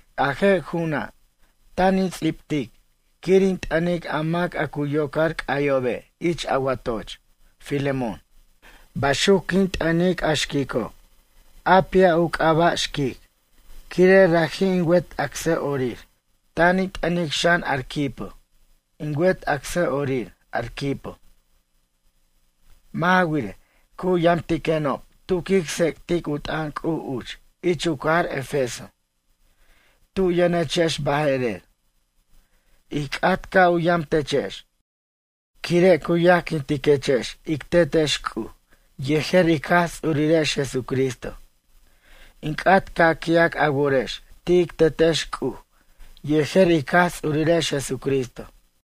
A je' ju'una', tan in ts'ibtic, quir in t'ʌnic a mac a cu yocar c'ayobe' ich a watoch, Filemón. Baxuc quin t'ʌnic a xquico', Apia, u c'aba' xquic, quire' raji' in wet acsʌ'orir. Tan in t'ʌnic xan Arquipo in wet acsʌ'orir, Arquipo. Mʌ' ja wirej, cu yamtiquenob tu quic tsec'tic u t'ʌn C'uj uch ich u cajar Efeso. Tu yʌnechex baje'rer. Ij c'at, ca' u yamtechex, quire' cu yajquintiquechex ic Tetex C'uj yejer ic Jaj Ts'urirex Jesucristo. In c'at ca' qui'ac a worex ti' ic Tetex C'uj yejer ic Jaj Ts'urirex Jesucristo.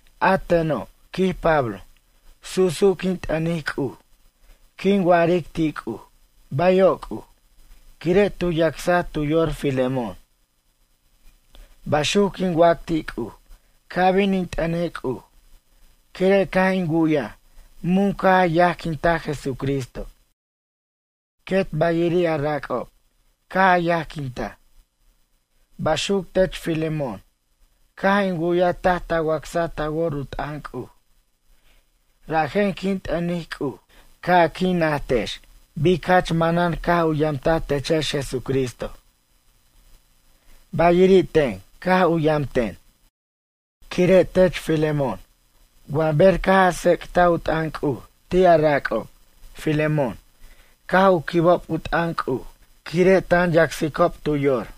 A teno', quij Pablo, su'su' quin t'ʌnic C'uj. Quin wa'aric ti' C'uj: “Bayo' C'uj, quire' tu yacsa tu yor Filemón.” Baxuc quin wac ti' C'uj ca' bin in t'ʌnej C'uj. Quire' caj in wu'yaj, mun caj a yajquinta Jesucristo, quet bayiri' a rac'ob caj a yajquintaj. Baxuc tech Filemón, caj in wu'yaj taj ta wacsa ta wor u t'ʌn C'uj. Rajen quin t'ʌnic C'uj ca' a qui' najtex bic jach manan caj u yamtaj techex Jesucristo. Bayiri' ten caj u yamten. Quire' tech Filemón wa ber caj a tsec'taj u t'ʌn C'uj ti' a rac'ob, Filemón caj u quibob u t'ʌn C'uj quire' tan yacsicob tu yor.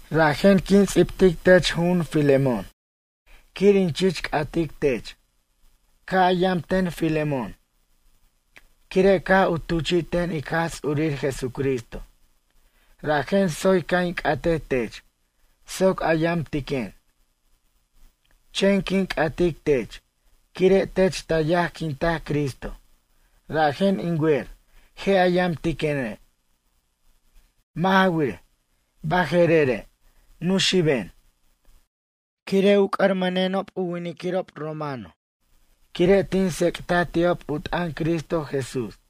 Rajen quin ts'ibtic tech ju'un Filemón, quir in chich c'atic tech. Ca' a yam ten Filemón. Quire' caj u tuchi'ten ic Jaj Ts'ur Jesucristo, rajen tsoy ca' in c'atej tech soc a yamtiquen. Chen quin c'atic tech quire' tech ta yajquinta Cristo, rajen in wer je' a yamtiquene'. Mʌ' ja wirej, baje'rere' nuxiben, quire' u c'ʌrʌmʌnenob u winiquirob romano quire' tin tsec'ta ti'ob u t'ʌn Cristo Jesús.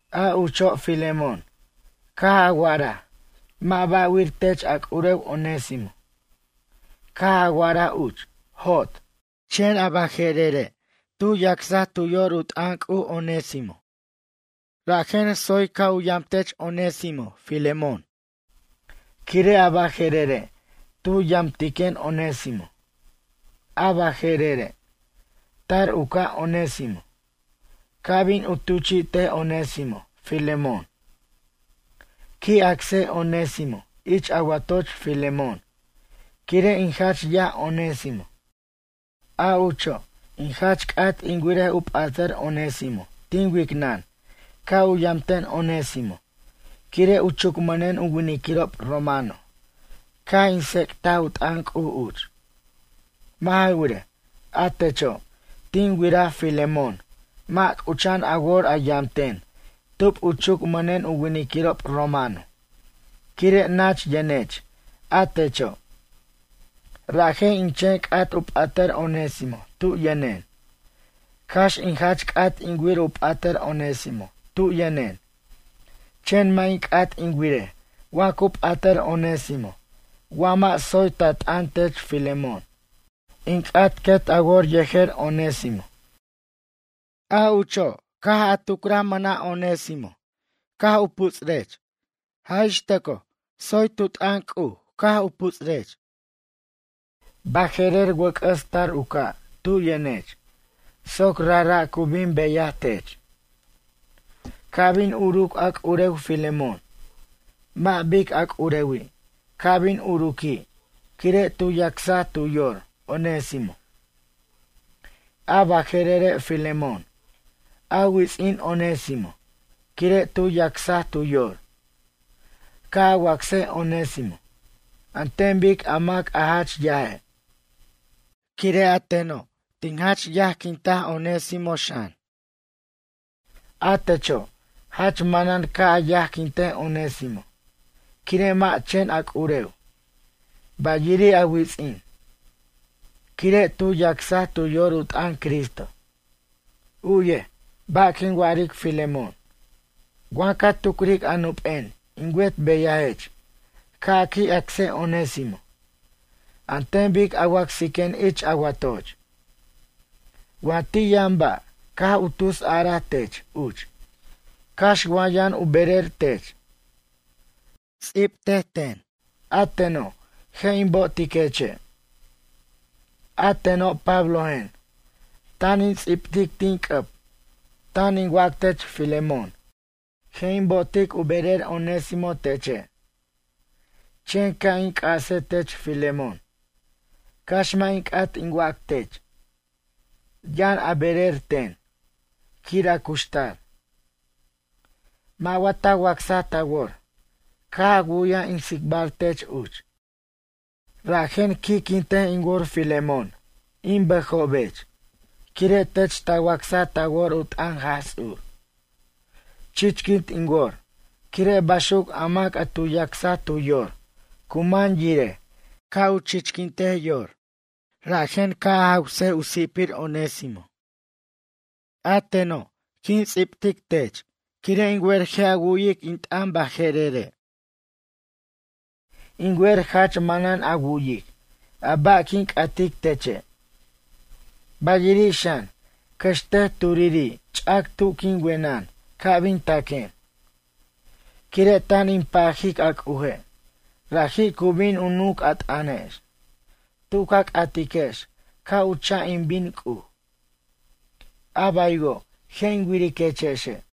A ucho' Filemón, caj a wa'araj mʌ' ba'wir tech a c'urew Onésimo. Caj a wa'araj uch: “Jot.” Chen a baje'rere' tu yacsa tu yor u t'ʌn C'uj, Onésimo. Rajen tsoy, ca' u yamtech Onésimo, Filemón, quire' a baje'rere' tu yamtiquen Onésimo. A baje'rere', tar u ca', Onésimo, ca' bin in tuchi'tej Onésimo, Filemón. Qui' acsej Onésimo ich a watoch Filemón quire' in jach yaj Onésimo. A ucho', in jach c'at in wirej u p'atʌr Onésimo tin wicnʌn ca' u yamten Onésimo quire' u chucmʌnen u winiquirob romano caj in tsec'taj u t'ʌn C'uj uch. Mʌ' ja wirej, a techo', tin wiraj Filemón mʌ' c'ucha'an a wor a yamten tub u chucmʌnen u winiquirob romano quire' nach yʌnech a techo'. Rajen in chen c'at u p'atʌr Onésimo tu yʌnen. Cax in jach c'at in wir u p'atʌr Onésimo tu yʌnen, chen mʌ' in c'at in wirej wa cu p'atʌr Onésimo wa mʌ' tsoy ta t'ʌn tech Filemón. In c'at quet a wor yejer Onésimo. A ucho' caj a tucraj mʌna' Onésimo, caj u putsurech, jaj ix tʌco tsoy tu t'ʌn C'uj caj u puts'urech. Baje'rer wʌc'ʌs tar u ca' tu yʌnech soc rajra' cu bin beyaj tech. Ca' bin uruc a c'urew Filemón, mʌ' bic a c'urewi' ca' bin uruqui' quire' tu yacsaj tu yor, Onésimo. A baje'rere' Filemón, a wits'in Onésimo, quire' tu yacsaj tu yor. Ca' a wacsej Onésimo, an ten bic a mac a jach yaje'. Quire' a teno' in jach yajquinta Onésimo xan. A techo', jach manan ca' a yajquintej Onésimo, quire' mʌ' chen a c'urew, bayiri' a wits'in. Quire' tu yacsaj tu yor u t'ʌn Cristo. U'yej, ba' quin wa'aric Filemón, wa ca tucric a nup'en in wet beyajech ca' a qui' acsej Onésimo an ten bic a wacsiquen ich a watoch. Wa ti' yʌn ba' caj u tusaraj tech uch cax wa yʌn u berer tech. Ts'ibtej ten, a teno' je' in bo'otiqueche'. A teno' Pablojen, tan in ts'ibtic tin c'ʌb tan in wac tech Filemón, je' in bo'otic u berer Onésimo teche'. Chen ca' in c'ase tech Filemón, cax mʌ' in c'at in wac tech. Yʌn a berer, ten, quir a cuxtar. Mʌ' wa ta wacsaj ta wor caj a wu'yaj in tsicbar tech uch? Rajen qui'quintej in wor Filemón in bʌjobech quire' tech ta wacsa ta wor u t'ʌn Jaj Ts'ur. Chichquint in wor quire' baxuc a mac a tu yacsa tu yor cu man yirej caj u chichquintej yor, rajen ca' a jaws u si'pir Onésimo. A teno' in ts'ibtic tech quire' in wer je' a wu'yic in t'ʌne' jerere'. In wer jach manan a wu'yic a ba' quin c'atic teche'. Bayiri' xan, cʌxtej turiri' ch'ac tu quin wenʌn ca' bin taquen, quire' tan in pajic a C'uje' raji' cu bin u nunc a t'ʌnex, tu ca c'atiquex ca' u cha' in bin C'uj. A baywo' je' in wiriquexe'.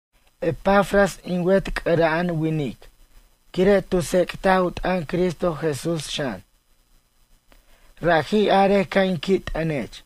Epafras, in wet c'ara'an winic quire' tu tsec'taj u t'ʌn Cristo Jesús xan. Raji' arej ca' in qui' t'ʌnech.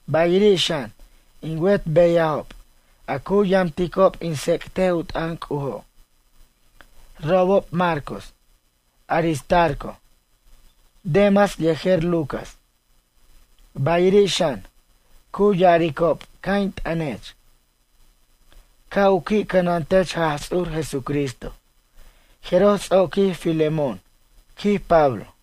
Bayiri' xan in wet beyajob, a cu yamticob in tsec'tej u t'ʌn C'ujo'. Robob Marcos, Aristarco, Demas yejer Lucas. Bayiri' xan cu ya'aricob ca' in t'ʌnech. Ca' u qui' cʌnantech Jaj Ts'ur Jesucristo jeroj ts'oqui Filemón, quij Pablo.